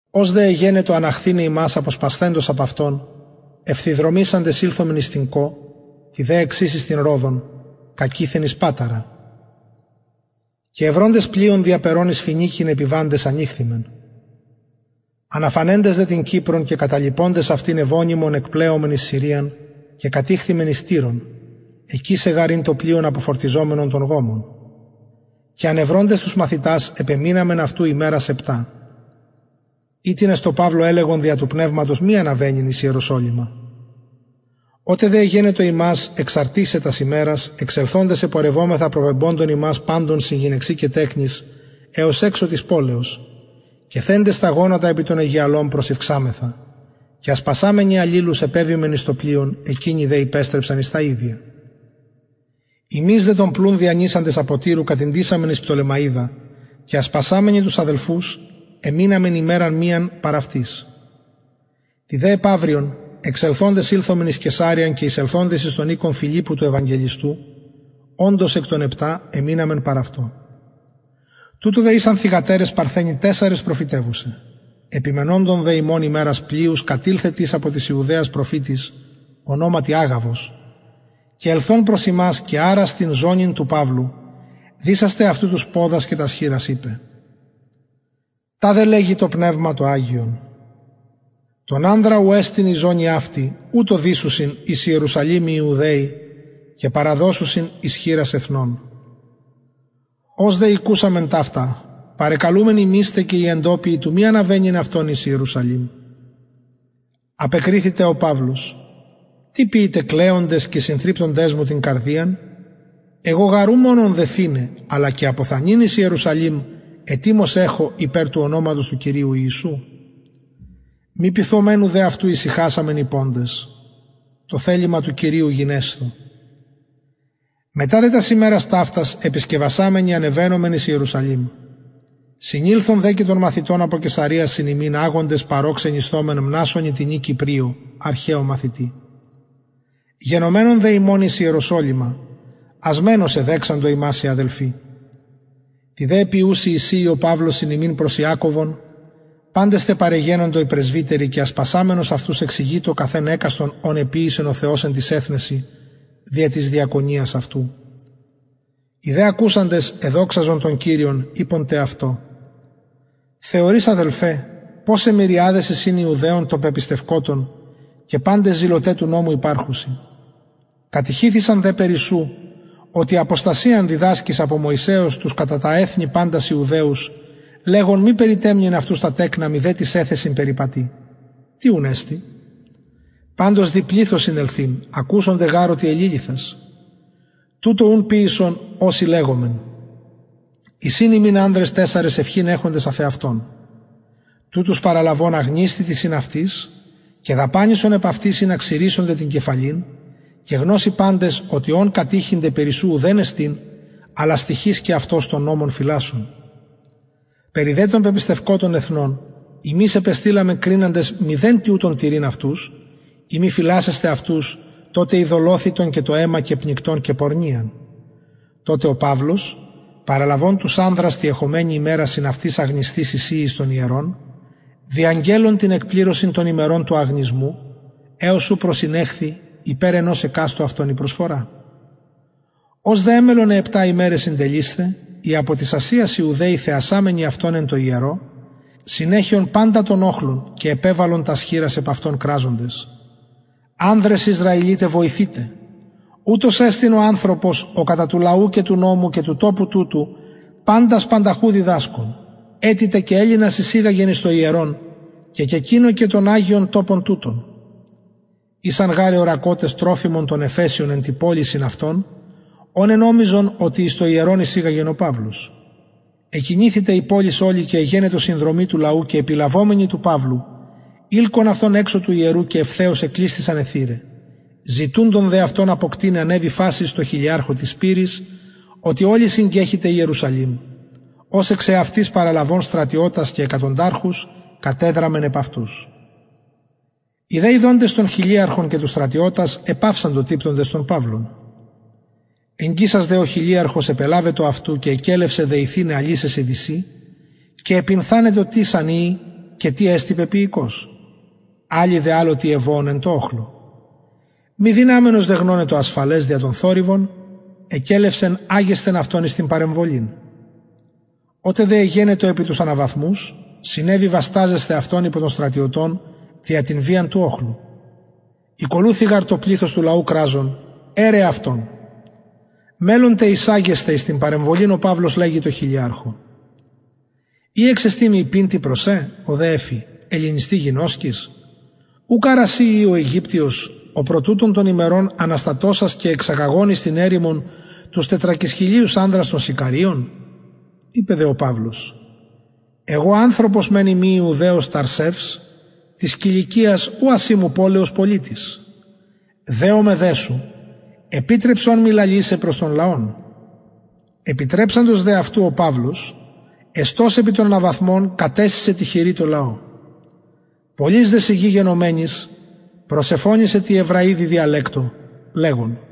ως δε εγενετο αναχθηναι ημας αποσπασθεντας απ αυτων ευθυδρομησαντες ηλθομεν εις την κων τη δε εξης εις την ροδον κακειθεν εις παταρα και ευροντες πλοιον διαπερων εις φοινικην επιβαντες ανηχθημεν αναφανεντες δε την κυπρον και καταλιποντες αυτην ευωνυμον επλεομεν εις συριαν και κατηχθημεν εις τυρον εκεισε γαρ ην το πλοιον αποφορτιζομενον τον γομον και ανευροντες μαθητας επεμειναμεν αυτου ημερας επτα οιτινες τω παυλω ελεγον δια του πνευματος μη αναβαινειν εις ιερουσαλημ οτε δε εγενετο ημας εξαρτισαι τας ημερας εξελθοντες επορευομεθα προπεμποντων ημας παντων συν γυναιξιν και τεκνοις εως εξω της πολεως και θεντες τα γονατα επι τον αιγιαλον προσηυξαμεθα και ασπασαμενοι αλληλους επεβημεν εις το πλοιον εκεινοι δε υπεστρεψαν εις τα ιδια ημεις δε τον πλουν διανυσαντες απο τυρου κατηντησαμεν εις πτολεμαιδα και ασπασαμενοι τους αδελφους εμειναμεν ημεραν μιαν παρ αυτοις τη δε επαυριον εξελθοντες οι περι τον παυλον ηλθον εις καισαρειαν και εισελθοντες εις τον οικον φιλιππου του ευαγγελιστου οντος εκ των επτα εμειναμεν παρ αυτω τουτω δε ησαν θυγατερες παρθενοι τεσσαρες προφητευουσαι επιμενοντων δε ημων ημερας πλειους κατηλθεν τις απο της ιουδαιας προφητης ονοματι αγαβος και ελθων προς ημας και αρας την ζωνην του παυλου δησας τε αυτου τους ποδας και τας χειρας ειπεν ταδε λεγει το πνευμα το αγιον τον ανδρα ου εστιν η ζωνη αυτη ουτως δησουσιν εν ιερουσαλημ οι ιουδαιοι και παραδωσουσιν εις χειρας εθνων ως δε ηκουσαμεν ταυτα παρεκαλουμεν ημεις τε και οι εντοπιοι του μη αναβαινειν αυτον εις ιερουσαλημ απεκριθη τε ο παυλος τι ποιειτε κλαιοντες και συνθρυπτοντες μου την καρδιαν εγω γαρ ου μονον δεθηναι αλλα και αποθανειν εις ιερουσαλημ ετοιμως εχω υπερ του ονοματος του κυριου ιησου μη πειθομενου δε αυτου ησυχασαμεν ειποντες το θελημα του κυριου γενεσθω μετα δε τας ημερας ταυτας επισκευασαμενοι ανεβαινομεν εις ιερουσαλημ συνηλθον δε και των μαθητων απο καισαρειας συν ημιν αγοντες παρ ω ξενισθωμεν μνασωνι τινι κυπριω αρχαιω μαθητη γενομενων δε ημων εις ιεροσολυμα ασμενως εδεξαντο ημας οι αδελφοι τη δε επιουση εισηει ο παυλος συν ημιν προς ιακωβον παντες τε παρεγενοντο οι πρεσβυτεροι και ασπασαμενος αυτους εξηγειτο καθ εν εκαστον ων εποιησεν ο θεος εν τοις εθνεσιν δια της διακονιας αυτου οι δε ακουσαντες εδοξαζον τον κυριον ειποντες αυτω θεωρεις αδελφε ποσαι μυριαδες εισιν ιουδαιων των πεπιστευκοτων και παντες ζηλωται του νομου υπαρχουσιν κατηχηθησαν δε περι σου οτι αποστασιαν διδασκεις απο μωυσεως τους κατα τα εθνη παντας ιουδαιους λεγων μη περιτεμνειν αυτους τα τεκνα μηδε τοις εθεσιν περιπατειν τι ουν εστιν παντως δει πληθος συνελθειν ακουσονται γαρ οτι εληλυθας τουτο ουν ποιησον ο σοι λεγομεν εισιν ημιν ανδρες τεσσαρες ευχην εχοντες εφ εαυτων τουτους παραλαβων αγνισθητι συν αυτοις και δαπανησον επ αυτοις ινα ξυρησωνται την κεφαλην και γνωσιν παντες οτι ων κατηχηνται περι σου ουδεν εστιν αλλα στοιχεις και αυτος τον νομον φυλασσων περι δε των πεπιστευκοτων εθνων ημεις επεστειλαμεν κριναντες μηδεν τοιουτον τηρειν αυτους ει μη φυλασσεσθαι αυτους το τε ειδωλοθυτον και το αιμα και πνικτον και πορνειαν τοτε ο παυλος παραλαβων τους ανδρας τη εχομενη ημερα συν αυτοις αγνισθεις εισηει εις το ιερον διαγγελλων την εκπληρωσιν των ημερων του αγνισμου εως ου προσηνεχθη υπερ ενος εκαστου αυτων η προσφορα ως δε εμελλον αι επτα ημεραι συντελεισθαι οι απο της ασιας ιουδαιοι θεασαμενοι αυτον εν τω ιερω συνεχεον παντα τον οχλον και επεβαλον τας χειρας επ αυτον κραζοντες ανδρες ισραηλιται βοηθειτε ουτος εστιν ο ανθρωπος ο κατα του λαου και του νομου και του τοπου τουτου παντας πανταχου διδασκων ετι τε και ελληνας εισηγαγεν εις το ιερον και κεκοινωκεν τον αγιον τοπον τουτον ησαν γαρ εωρακοτες τροφιμον τον εφεσιον εν τη πολει συν αυτω ον ενομιζον οτι εις το ιερον εισηγαγεν ο παυλος εκινηθη τε η πολις ολη και εγενετο συνδρομη του λαου και επιλαβομενοι του παυλου ειλκον αυτον εξω του ιερου και ευθεως εκλεισθησαν αι θυραι ζητουντων δε αυτον αποκτειναι ανεβη φασις τω χιλιαρχω της σπειρης οτι ολη συγκεχυται ιερουσαλημ ος εξαυτης παραλαβων στρατιωτας και εκατονταρχους κατεδραμεν επ αυτους οι δε ιδοντες τον χιλιαρχον και τους στρατιωτας επαυσαντο τυπτοντες τον παυλον εγγισας δε ο χιλιαρχος επελαβετο αυτου και εκελευσεν δεθηναι αλυσεσιν δυσιν και επυνθανετο τις αν ειη και τι εστιν πεποιηκως αλλοι δε αλλο τι εβοων εν τω οχλω μη δυναμενος δε γνωναι το ασφαλες δια τον θορυβον εκελευσεν αγεσθαι αυτον εις την παρεμβολην οτε δε εγενετο επι τους αναβαθμους συνεβη βασταζεσθαι αυτον υπο των στρατιωτων δια την βιαν του οχλου ηκολουθει γαρ το πληθος του λαου κραζον αιρε αυτον μελλων τε εισαγεσθαι εις την παρεμβολην ο παυλος λεγει τω χιλιαρχω ει εξεστιν μοι ειπειν προς σε ο δε εφη ελληνιστι γινωσκεις ουκ αρα συ ει ο αιγυπτιος ο προ τουτων των ημερων αναστατωσας και εξαγαγων εις την ερημον τους τετρακισχιλιους ανδρας των σικαριων ειπεν δε ο παυλος εγω ανθρωπος μεν ειμι ιουδαιος ταρσευς της κιλικιας ουκ ασημου πολεως πολιτης δεομαι δε σου επιτρεψον μοι λαλησαι προς τον λαον επιτρεψαντος δε αυτου ο παυλος εστως επι των αναβαθμων κατεσεισεν τη χειρι τω λαω πολλης δε σιγης γενομενης προσεφωνει τη εβραιδι διαλεκτω λεγων